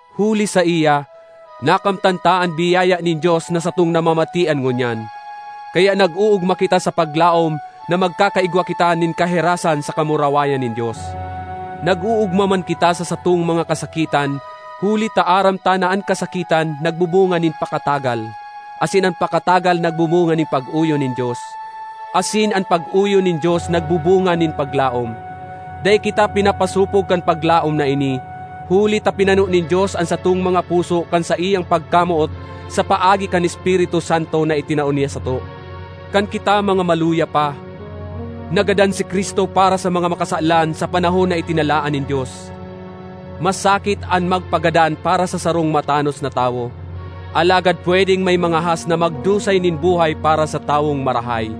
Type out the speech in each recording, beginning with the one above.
Huli saiya, nakamtan ta an biyaya nin Dios na satong namamatean ngunyan. Kaya nag-oogma kita sa paglaom na magkakaigwa kita nin kahirasan sa kamurawayan nin Dios. Nag-oogma man kita sa satong mga kasakitan huli ta aram ta na an kasakitan nagbubunga nin pakatagal, asin an pakatagal nagbubunga nin pag-oyon nin Dios, asin an pag-oyon nin Dios nagbubunga nin paglaom. Dai kita pinapasopog kan paglaom na ini, huli ta pinano nin Dios an satong mga puso kan saiyang pagkamoot sa paagi kan Espiritu Santo na itinao niya sato. Kan kita mga maluya pa, nagadan si Cristo para sa mga makasalan, sa panahon na itinalaan nin Dios. Masakit an magpagadan para sa sarong matanos na tawo, alagad pwedeng may mangahas na magdusay nin buhay para sa tawong marahay.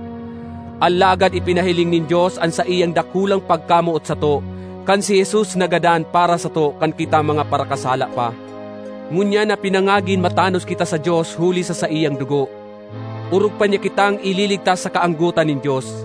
Alagad ipinahiling nin Dios an saiyang dakulang pagkamoot sato kan si Jesus nagadan para sato kan kita mga parakasala pa! Ngunyan na pinangagin matanos kita sa Dios huli sa saiyang dugo, orog pa niya kitang ililigtas sa kaanggotan nin Dios.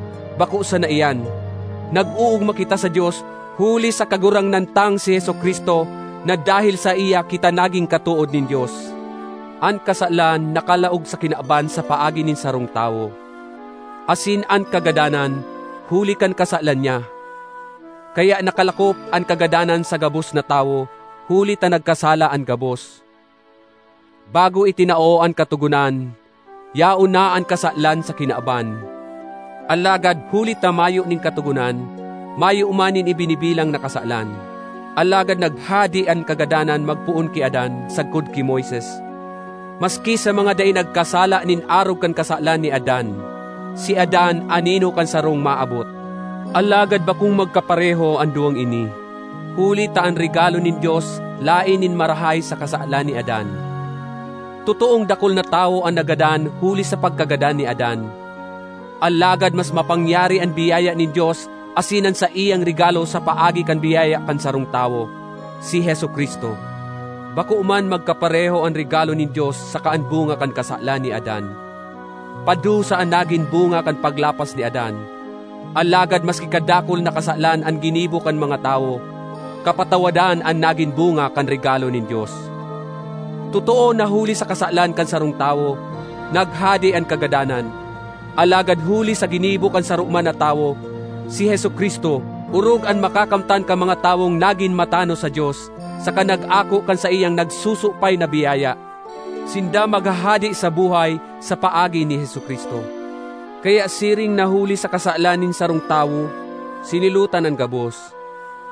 Bako sana iyan, nag-oogma kita sa Dios huli sa Kagurangnan tang si Jesu-Cristo, na dahel saiya kita naging katood nin Dios. An kasalan nakalaog sa kinaban sa paagi nin sarong tawo; asin an kagadanan, huli kan kasalan niya. Kaya nakalakop an kagadanan sa gabos na tawo, huli ta nagkasala an gabos. Bago itinao an Katogonan, yaon na an kasalan sa kinaban; alagad huli ta mayo nin katogonan, mayo man nin ibinibilang na kasalan. Alagad naghade an kagadanan magpoon ki Adan sagkod ki Moises, maski sa mga dai nagkasala nin arog kan kasalan ni Adan. Si Adan anino kan sarong maabot. Alagad bakong magkapareho an duwang ini, huli ta an regalo nin Dios laen nin marahay sa kasalan ni Adan. Totoong dakul na tawo an nagadan huli sa pagkagadan ni Adan. Alagad mas mapangyari an biyaya nin Dios asin an saiyang regalo sa paagi kan biyaya kan sarong tawo, si Jesu-Cristo. Bako man magkapareho an regalo nin Dios saka an bunga kan kasalan ni Adan. Padusa an nagin bunga kan paglapas ni Adan, alagad maski kadakul na kasalan an ginibo kan mga tawo, kapatawadan an nagin bunga kan regalo nin Dios. Totoo na huli sa kasalan kan sarong tawo, naghade an kagadanan; alagad huli sa ginibo kan saro man na tawo, si Jesu-Cristo, orog an makakamtan kan mga tawong nagin matanos sa Dios saka nag-ako kan saiyang nagsusupay na biyaya. Sinda maghahade sa buhay sa paagi ni Jesu-Cristo. Kaya siring na huli sa kasalan nin sarong tawo sinilotan an gabos,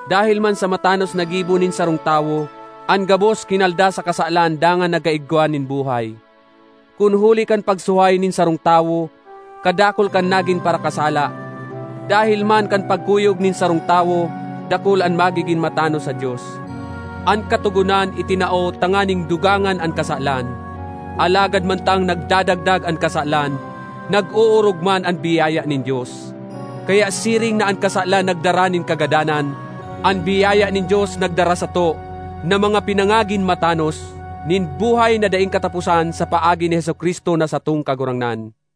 dahel man sa matanos na gibo nin sarong tawo, an gabos kinalda sa kasalan dangan nagkaigwa nin buhay. Kun huli kan pagsuhay nin sarong tawo, kadakul kan nagin parakasala; dahel man kan pagkuyog nin sarong tawo, dakul an magigin matanos sa Dios. An Katogonan itinao tanganing dugangan an kasalan; alagad mantang nagdadagdag an kasalan, nag-oorog man an biyaya nin Dios. Kaya siring na an kasalan nagdara nin kagadanan, an biyaya nin Dios nagdara sato, na mga pinangagin matanos, nin buhay na daing kataposan sa paagi ni Jesu-Cristo na satong Kagurangnan.